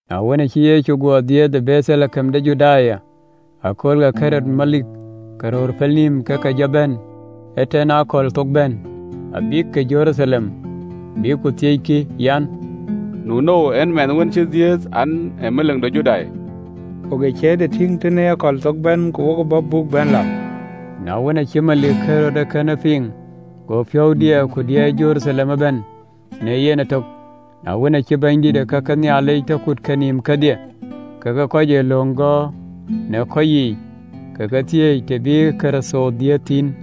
Na wën, aacï Yecu guɔ dhiëëth ë Betheleɣem de Judaya në akööl ke Ɣerod melik, ke röör pelnïïm ke ke jɔ bɛ̈n të lɔ aköl amiäk, abïkï Jeruthalem, bïk ku thiëckï an, “Nu ënou en ë mɛnh wën cï dhiëëth an, ee melik de Judai? Wok ë ciëërde tïŋ të lɔ aköl amiäk, ku wok ë bɔ̈ buk bɛ̈n lam. Na wën, aacï melik Ɣerod ee kënë piŋ, go piɔ̈u diɛɛr, ku diɛɛr Jeruthalem ëbɛ̈n në yen ëtök. Na wën, aacï bänydït ke kake Nhialic tɔ kut kenïïm kedhie kekë kɔc ë löŋ gɔ̈ɔ̈r në kɔc yiic, ke ke thiëëc an, “Ee tënou yen bï Kërtho dhiëëth thïn?”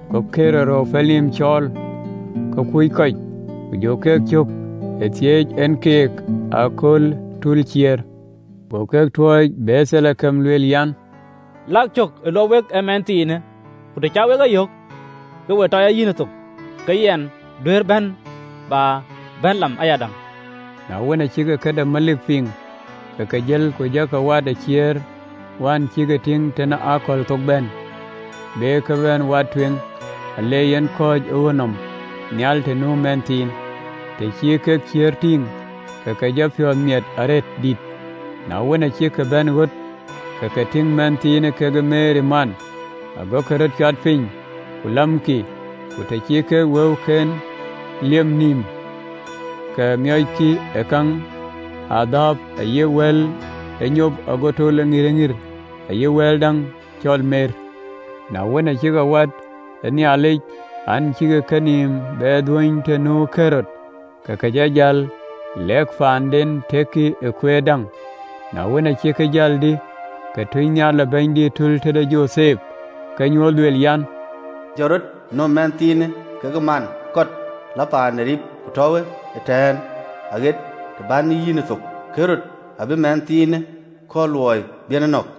Go Ɣerod röör pelnïïm cɔɔl ke kuc kɔc, ku jɔ ke cök ë thiëëc en keek ë akööl ë tulë ciëër. Go ke tuɔɔc Betheleɣem, lueel an, “Lak cök ë luɔp wek ee mɛnhthiinë, ku të cä wek ye yök, ke we tɔ ya yïnë thok, ke yɛn duëër bɛ̈n bä bɛ̈n lam ayadäŋ.” Na wën, acïk këde melik piŋ, ke ke jël, ku jɔ ke wat ë ciëër wään cïk tïŋ të lɔ aköl amiäk, be ke wat tueŋ, ale yen kɔ̈ɔ̈c ë ɣöt nɔm nhial të nu meth thïn. Të cï kek ciëër tïŋ, ke ke jɔ piɔ̈ɔ̈th miɛt arëët diitë. Na wën, acïk bɛ̈n ɣöt, ke ke tïŋ mɛnhthiinë kekë Meri man, agokï röt cuat piny, ku lamkï, ku të cï kek wëuken liep nïïm, ke miɔckï ë käŋ, adhääp ayï wal ŋïr, ayï mer. Na wën, acï ke wɛ̈ɛ̈t ë Nhialic në nyuöthic an, cïkï kenïïm be dhuöny të nu Ɣerod, ke ke jɔ jäl lek paanden tëkkï ë kueer däŋ. Na wën, aa cïk jäl dï, ke tunynhial ë Bɛ̈nydït tul tëde Jothep ke ye nyuöth, lueel an, “Jɔt rɔt, nöm mɛnhthiinë kekë man, kɔt lɔ paan ë Rip, ku tɔ̈uwë ëtɛ̈ɛ̈n aɣet të bän yï yiɛ̈n thok, Ɣerod abï mɛnhthiinë kɔɔr luɔi bï en e nɔ̈k.”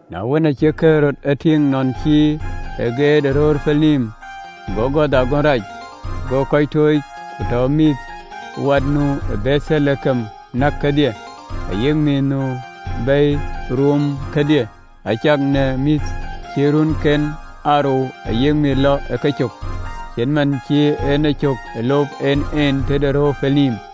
Na wën, acï Ɣerod ë tïŋ nɔn cï ë geet në röör pelnïïm, go gɔ̈th agönh rac, go kɔc tooc, ku tɔ mïthwät nu Betheleɣem näk kedhie, ayï mïth nu bɛ̈i ruup kedhie, cak në mïth cï runken aa rou ayï mïth lɔ ë kecök, cït man cï en ë cök ë lop en en tëde röör pelnïïm.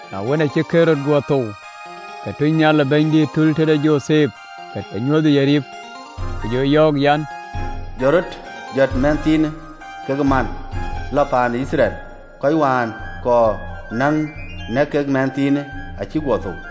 Na wën, acï Ɣerod guɔ thou, ke tunynhial ë Bɛ̈nydït tul të Jothep ke ë nyuöth ë Rip, Ku yöök an, “Jɔt rɔt, jɔt mɛnhthiinë kekë man, lɔ paan ë Yithriɛl, kɔc wään kɔɔr näŋ nɛ̈k kek mɛnhthiinë acïk guɔ thou.”